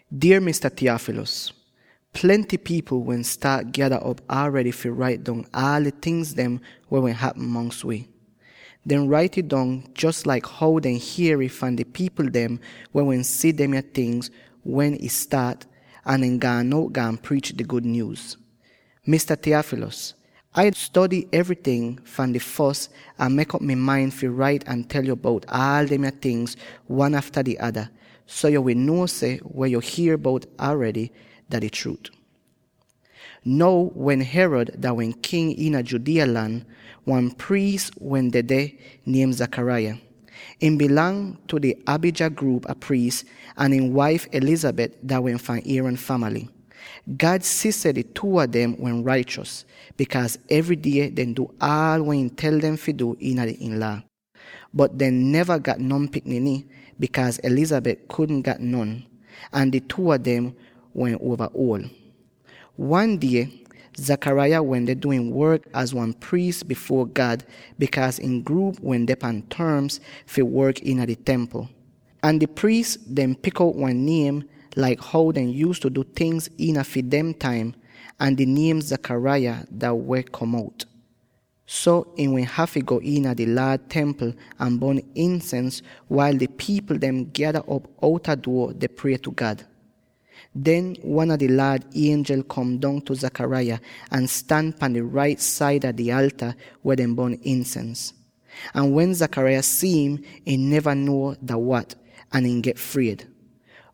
Dier Mista Theophilus: Plenty pipl wehn staat gyada op aredy fi rait dong aal di tingz weh wehn hapm mongs wi. Dehn rait'ih dong jos laik how dehn hier'ih fahn di pipl dem weh wehn si demya tingz wen ih staat, ahn den gaan out, gaan priich di gud nyuuz. Mista Theophilus, Ah stody evryting fahn di fos ahn mek'op mi main fi rait ahn tel yo bout aal demya tingz wan afta di ada, so yo wi nuo seh weh yo hier bout aredy, dah di chruut. Now wen Herod dah wehn king iina Judea lan, wan priis wehn dedeh, niem Zachariah. Ihn dah fi di Abijah gruup a priis, ahn ihn waif Elizabeth dah wehn fahn Aaron famaly. God si seh di two a dem wehn raichos, bikaaz evry die dehn du aal weh ihn tel dem fi du iina ihn Laa. Bot dehn neva gat non pikniny, bikaaz Elizabeth kudn gat non. Ahn di two a dem wehn uova uol. Wan die, Zechariah wende du ihn work laik wan priis bifuor God, bikaaz ihn gruup wende pan torms fi work iina di Templ. Ahn di priis dem pik out wan niem, laik how dehn yuuztu du tingz iina fi dem taim; ahn di niem Zechariah weh kom out. So, ihn wehn hafy go iina di Laad Templ ahn bon insens, wail di pipl dem gyada op outa duo deh prie tu God. Den, wan a di Laad ienjel kom dong tu Zechariah ahn stan pan di rait saida di alta weh dehn bon insens. Ahn wen Zechariah si'im, ihn neva nuo dah wat, ahn ihn get fried.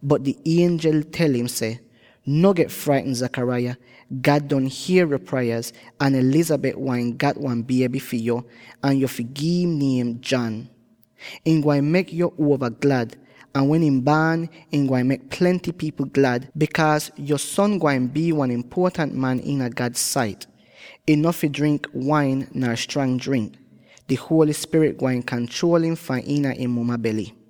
Bot di ienjel tel im seh, “No get fraitn Zechariah; God don hier yo prayaz, ahn Elizabeth gwain gat wan bieby fi yo, ahn yo fi gi'im niem John. Ihn gwain mek yo uova glad, ahn wen im baan, ihn gwain mek plenty pipl glad, bikaaz yo son gwain bii wan impuotant man iina God sait. Ihn no fi drink wain nar strang drink; di Holy Spirit gwain kanchruol im fahn iina ihn muma bely.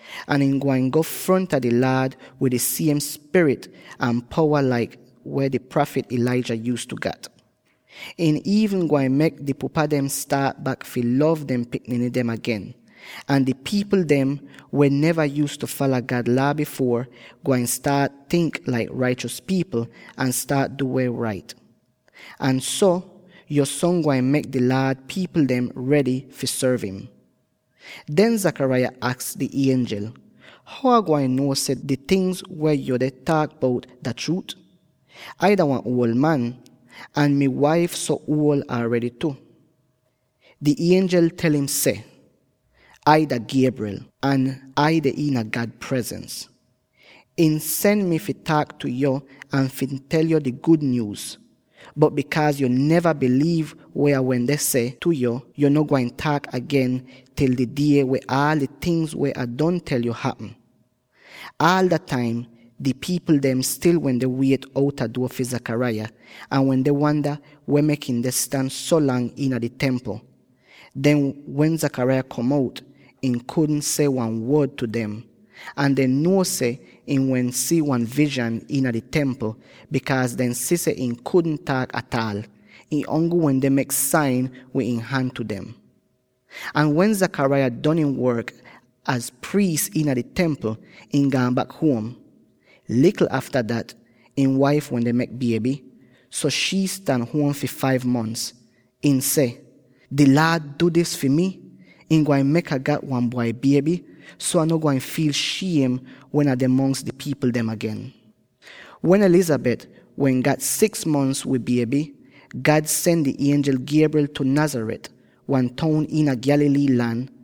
ahn ihn gwain go fronta di Laad wid di siem spirit ahn powa laik weh di prafit Elijah yuuztu gat. Ihn iivn gwain mek di pupa dem staat lov bak dehn pikniny dem agen. Ahn di pipl dem, weh neva yuuztu fala God Laa bifuor, gwain staat tink laik raichos pipl ahn staat du weh rait. Ahn so, yo son gwain mek di Laad pipl dem redy fi sorv im.” Den Zechariah aks di ienjel, “How Ai gwain nuo seh di ting dem weh yuu deh taak bout dah chruut? Ai dah wan uol man, ahn mi waif so uol aredy tu.” Di ienjel tel im seh, “Ai dah Gabriel, ahn Ai deh iina God presens. Ihn sen mi fi taak tu yo ahn fi tel yo dis gud nyuuz. Bot bikaaz yo neva biliiv weh Ah wende seh tu yo, yo no gwain taak agen til di die wen aal di tingz weh Ah don tel yo hapm.” Aal da'taim di pipl dem stil wende wiet outa duo fi Zechariah, ahn wende wanda weh mek ihn deh stan so lang iina di Templ. Den, wen Zechariah kom out, ihn kudn seh wan wod tu dem. Ahn dehn nuo seh ihn wehn si wan vizhan iina di Templ, bikaaz dehn si seh ihn kudn taak ataal; ihn ongl wende mek sain wid ihn han tu dem. Ahn wen Zechariah don ihn work az priis iina di Templ, ihn gaan bak huom. Likl afta dat, ihn waif wende mek bieby, so shii stan huom fi five mons. Ihn seh, “Di Laad du dis fi mi; ihn gwain mek Ah gat wan bwai bieby, so Ah no gwain fiil shiem wen Ah deh mongs di pipl dem agen.” Wen Elizabeth wehn gat six mons wid bieby, God sen di ienjel Gabriel tu Nazareth —wan toun iina Galilee lan—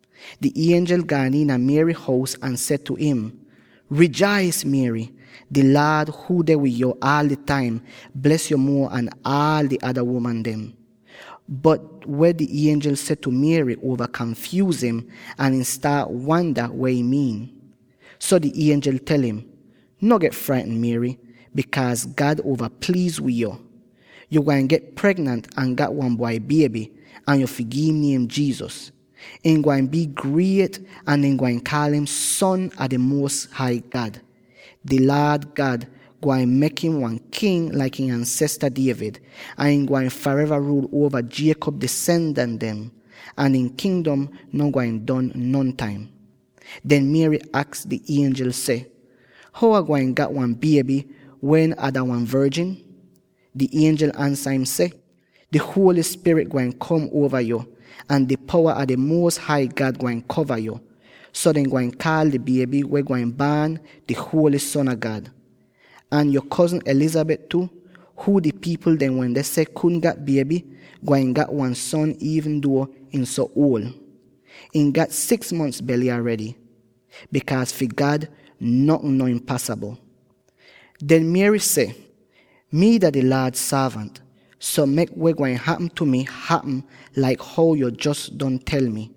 Di ienjel gaan iina Mary hous ahn seh tu im, “Rijais, Mary, di Laad, huu deh wid yo aal di taim, bles yo muo an aal di ada uman dem!” Bot weh di ienjel seh tu Mary uova kanfyuuz im, ahn ihn staat wanda weh ihn miin. So di ienjel tel im, “No get fraitn Mary, bikaaz God uova pliiz wid yo. Yo gwain get pregnant ahn gat wan bwai bieby, ahn yo fi gi'im niem Jesus. Ihn gwain bii griet ahn dehn gwain kaal im ‘Son a di Muos Hai God.’ Di Laad God gwain mek im wan king laik ihn ansesta David, ahn ihn gwain fareva ruul uova Jacob disendant dem, ahn ihn Kingdom no gwain don nontaim.” Den Mary aks di ienjel seh, “How Ah gwain gat wan bieby wen Ai dah wan vorjin?” Di ienjel ansa im seh, “Di Holy Spirit gwain kom uova yo, ahn di powa a di Muos Hai God gwain kova yo, so dehn gwain kaal di bieby weh gwain baan di huoly Son a God. Ahn yo kozn Elizabeth tu —huu di pipl dem wehn seh kudn gat bieby— gwain gat wan son iivn duo ihn so uol. Ihn gat six mons bely aredy. Bikaaz fi God notn no impasabl.” Den Mary seh, “Mii dah di Laad sorvant, so mek weh gwain hapm tu mi, hapm laik how yo jos don tel mi.”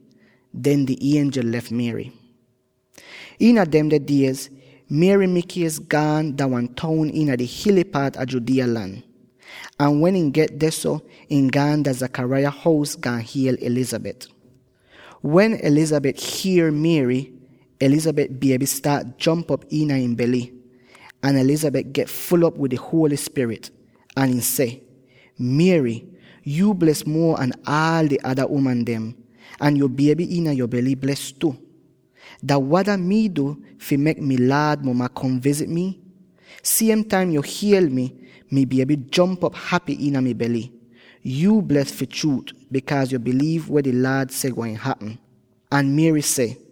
Den di ienjel lef Mary. Iina demde diez, Mary mikies gaan dah wan toun iina di hily paat a Judea lan. Ahn wen ihn get dehso, ihn gaan dah Zechariah hous, gaan hiel Elizabeth. Wen Elizabeth hier Mary, Elizabeth bieby staat jomp op iina ihn bely, ahn Elizabeth get ful'op wid di Holy Spirit, ahn ihn seh, “Mary, yuu bles muo an aal di ada uman dem, ahn yo bieby iina yo bely bles tu. Dah wada mii du fi mek mi Laad muma kom vizit mii? Siem taim yo hiel mi, mi bieby jomp op hapy iina mi bely. Yuu bles fi chruut, bikaaz yo biliiv weh di Laad seh gwain hapm.” Ahn Mary seh: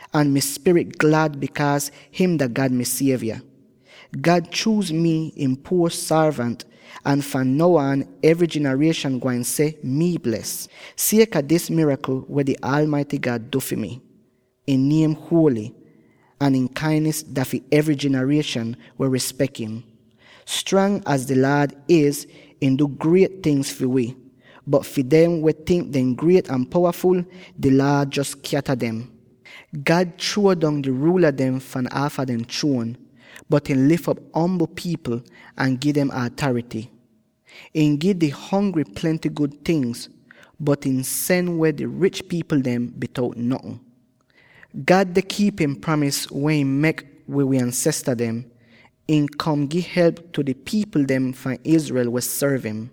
ahn mi spirit glad bikaaz him dah God mi Sievya. God chuuz mi, ihn puor sorvant, ahn fahn now aan evry jinarieshan gwain seh mi bles, sieka dis mirakl weh di Aalmaity God du fi mi. Ihn niem huoly, ahn ihn kainis dah fi evry jinarieshan weh rispek im. Strang az di Laad iz, ihn du griet tingz fi wi, bot fi dem weh tink dehn griet ahn powaful, di Laad jos skyata dem. God chruo dong di ruula dem fahn aafa dehn chruon, bot ihn lif op ombl pipl ahn gi dem atarity. Ihn gi di hongry plenty gud ting, bot ihn sen weh di rich pipl dem bitout notn. God deh kiip ihn pramis weh ihn mek wid wi uol pipl dem; ihn kom gi help tu di pipl fahn Israel weh sorv im.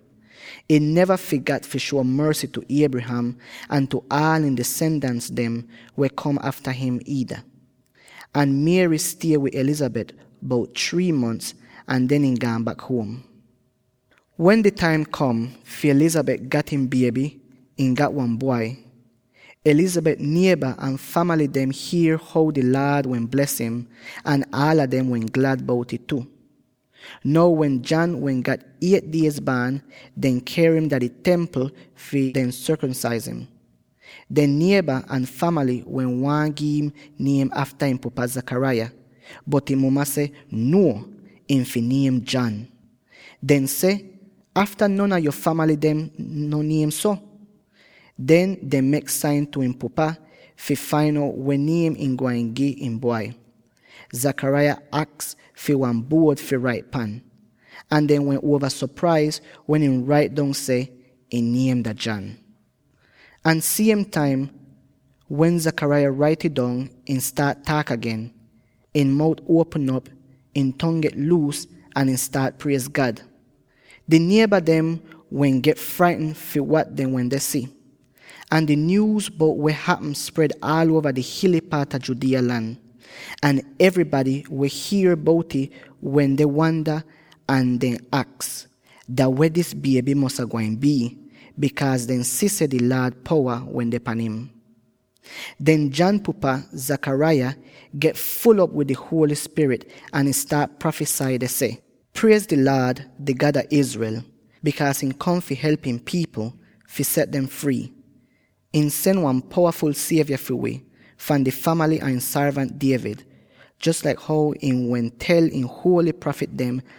Ihn neva figat fi shuo morsy tu Abraham, ahn tu aal ihn disendans dem weh kom afta him niida.” Ahn Mary stie wid Elizabeth bout three mons ahn den ihn gaan bak huom. Wen di taim kom fi Elizabeth gat ihn bieby, ihn gat wan bwai. Elizabeth nieba ahn famaly dem hier how di Laad wehn bles im, ahn aala dem wehn glad bout'ih tu. Now wen John wehn gat eight diez baan, dehn ker im dah di Templ fi deh sorkomsaiz im. Dehn nieba ahn famaly wehn waahn gi'im niem afta im pupa, Zechariah, bot ihn muma seh, “Nuo! Ihn fi niem John.” Dehn seh, “Afta non a yo famaly dem no niem so?” Den, dehn mek sain tu ihn pupa fi fain out weh niem ihn gwain gi ihn bwai. Zechariah aks fi wan buod fi rait pan. Ahn dehn wehn uova sopraiz wen ihn rait dong seh, “Ihn niem dah John.” Ahn siem taim wen Zechariah rait'ih dong, ihn staat taak agen —ihn mout uopm op, ihn tong get luus, ahn ihn staat priez God! Di nieba dem wehn get fraitn fi wat dehn wende si, ahn di nyuuz bout weh hapm spred aal uova di hily paat a Judea lan. Ahn evrybady weh hier bout'ih wende wanda, ahn dehn aks, “Dah weh dis bieby mosa gwain bii?” bikaaz dehn si seh di Laad powa wende pan im. Den John pupa, Zachariah, get ful'op wid di Holy Spirit ahn ihn staat prafisai deh seh: “Priez di Laad, di God a Israel, bikaaz ihn kom fi help ihn pipl, fi set dem frii. Ihn sen wan powaful sievya fi wi, fahn di famaly a ihn sorvant David, jos laik how ihn wehn tel ihn huoly prafit dem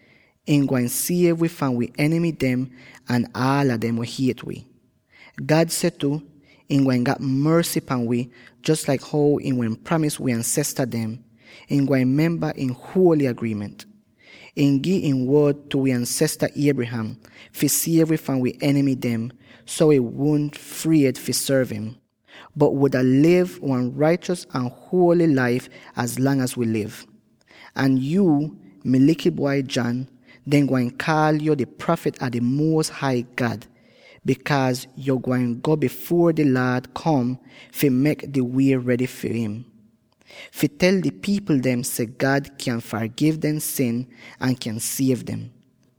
ihn gwain siev wi fahn wi enimy dem ahn aala dem weh hiet wi. God seh ihn gwain gat morsy pahn wi jos laik how ihn wehn pramis wi ansesta dem; ihn gwain memba ihn huoly agriiment. Ihn gi ihn wod tu wi ansesta Abraham, fi siev wi fahn wi enimy dem; so wi wudn fried fi sorv im, bot wuda liv wan raichos ahn huoly laif az lang az wi liv. Ahn yuu, mi likl bwai John, dehn gwain kaal yo di prafit a di Muos Hai God, bikaaz yo gwain go bifuor di Laad kom, fi mek di wie redy far im, fi tel di pipl dem seh God kyan fargiv dehn sin, ahn kyan siev dem.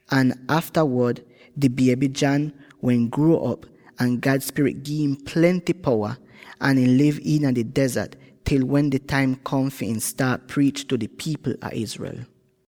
Ahn aftawod di bieby John wehn gruo'op, ahn God Spirit gi'im plenty powa, ahn ihn liv iina di dezart til wen di taim kom fi ihn staat priich tu di pipl fahn Israel.